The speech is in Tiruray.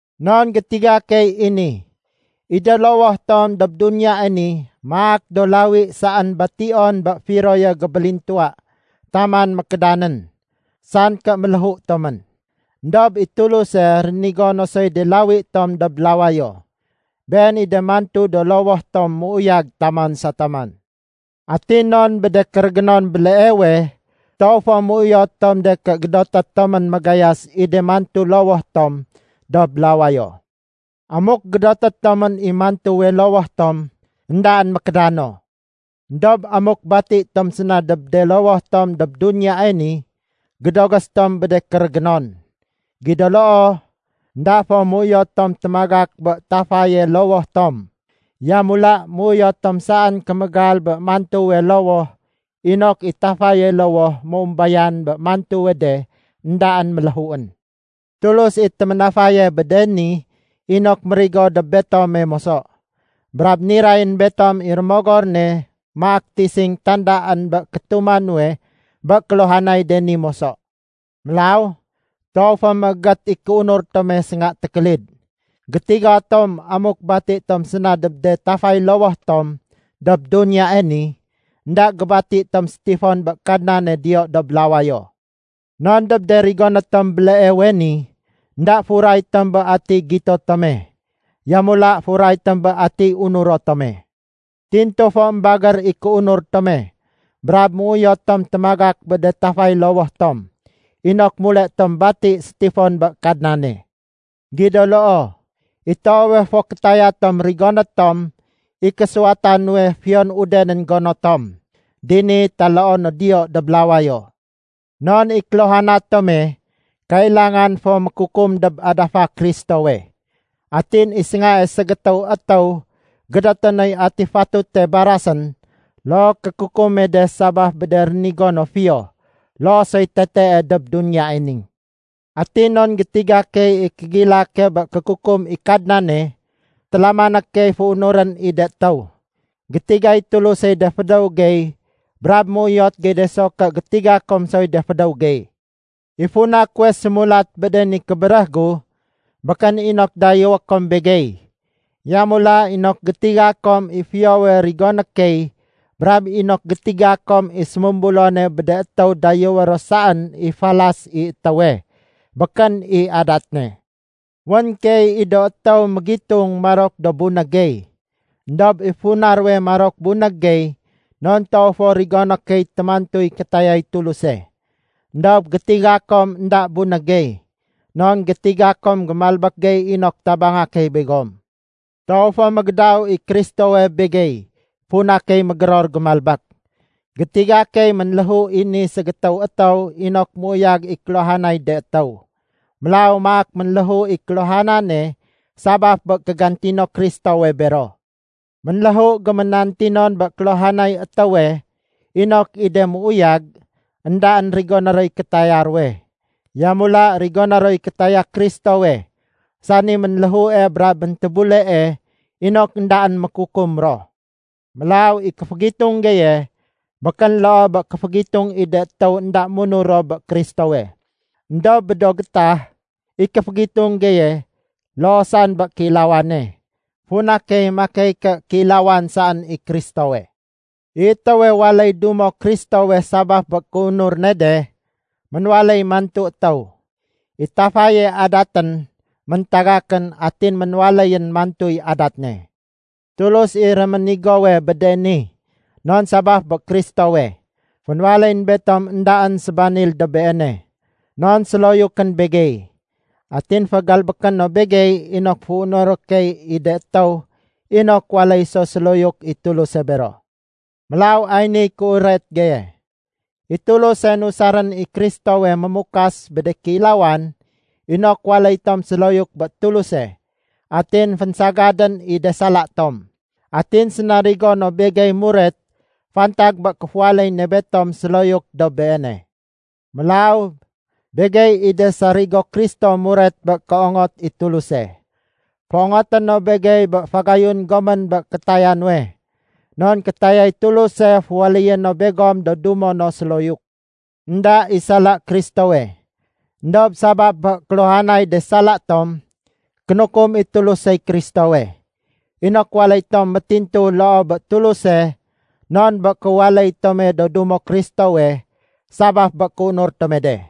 Non gétiga key i ni. I de lowoh tom dob duniyae ni maak do lawi saén bation bé firoye gébélintuwa taman mékédanén, san ké méléhu tomén. Endob i Tuluse rénigo no soy de lawi tom dob lawayo. Been i de mantu do lowoh tom méuyag taman sa taman. Atin non bé de kérégénon béleewe, toow fo méuyot tom de ké gédoté tomén magayas i de mantu lowoh tom dob lawayo. Amuk gédoté tomén i mantuwe lowoh tom, éndaén mékédano. Endob amuk bati tom séna dob de lowoh tom dob duniyae ni, gédogés tom bé de kérégénon. Gido loo, énda fo méuyot tom témagak bé tafaye lowoh tom. Yamula méuyot tom saén kémégal bé mantuwe lowoh inok i tafaye lowoh méumbayan bé mantuwe de éndaén méléhuén. Tulus i téménafaye bé de ni inok mérigo dob betome moso. Brab nirayén betom i Rémogor ne maak tising tandaén bé kétuma nuwe bé kéluhanay de ni moso. Mélaw toow fo méégét i kéunur tome sénga tékélid. Gétiga tom amuk bati tom séna dob de tafay lowoh tom dob duniyae ni, énda gébati tom sétifon bé Kadnane diyo dob lawayo. Non dob de rigoné tom béleewe ni, énda furay tom bé atiy gito tome, yamula furay tom bé atiy unuro tome. Tintu fo émbagér i kéunur tome brab méuyot tom témagak bé de tafay lowoh tom inok mule tom bati sétifon bé Kadnane. Gido loo, i toowe fo kétaya tom rigoné tom i késuwata nuwe fiyon udenén gono tom, dini taloo no diyo dob lawayo. Non i kéluhana tome kailangan fo mékukum dob adafa Kristowe. Atin i séngae ségétéw étéw gédoté noy ati fatute barasén look kékukume de sabaf bé de rénigo no, fiyo loo soy tetee dob duniyae ni. Atin non gétiga key i kégilake bé kékukum i Kadnane, télamané key féunurén i de étéw. Gétigay Tulusey de fédéw gey brab méuyot gey de so ké gétiga kom soy de fédéw gey. I funa kuwe sémulat bé de ni kébéréh gu, békén inok dayéwé kom begey. Yamula inok gétiga kom i fiyowe rigoné key brab inok gétiga kom i sémumbulone bé de étéw dayéwé ro saén i falas i étéwe, békén i adat ne. Wén keey i do étéw mégitung marok do bunég gey. Endob i funa ruwe marok bunég gey non toow fo rigoné key témantuy kétayay Tuluse. Endob gétiga kom énda bunég gey, non gétiga kom gémalbék gey inok tabanga key begom. Toow fo mégédaw i Kristowe begey funa key mégéror gémalbék. Gétiga key ménléhu i ni ségétéw étéw inok méuyag i kéluhanay de étéw. Mélaw maak ménléhu i kéluhanane sabaf bé kégantino Kristowe bero. Ménléhu géménantinon bé kéluhanay étéwe inok i de méuyag, éndaén rigoné roy kétaya ruwe. Yamula rigoné roy kétaya Kristowe, sani ménléhue brab méntébulee inok éndaén mékukum ro. Mélaw i kéfégitung geye békén loo bé kéfégitung i de étéw énda munur ro bé Kristowe. Endob bé do gétah, i kéfégitung geye loo saén bé kéilawane, funa key makey ké kéilawan saén i Kristowe. I étéwe waléy dumo Kristowe sabaf bé kéunur ne de, ménwaléy mantu étéw. I tafaye adatén méntagakén atin ménwaléyén mantuy adat ne. Tulus i réménigowe bé de ni, non sabaf bé Kristowe, fénwaléyén betom éndaén sébanil dob Beene. Non séloyukén begey. Atin fégalbéké no begey inok féunuré key i de étéw inok waléy so séloyuk i Tuluse bero. Mélaw ay niy kéuret geye: I Tuluse nusarén i Kristowe mémukas bé de kéilawan inok waléy tom séloyuk bé Tuluse atin fénsagadén i de sala tom. Atin sénarigo no begey muret fantag bé kéféwaléy ne betom séloyuk dob Beene. Mélaw begey i de sarigo Kristo muret bé kéongot i Tuluse. Féongoté no begey bé fagayun gomén bé kétaya nuwe. Non kétayay Tuluse féwaléyé no begom do dumo no séloyuk. Enda i sala Kristowe. Endob sabaf bé kéluhanay de sala tom, kénukum i Tulusey Kristowe, inok waléy tom métintu loo bé Tuluse non bé kéwaléy tome do dumo Kristowe sabaf bé kéunur tome de.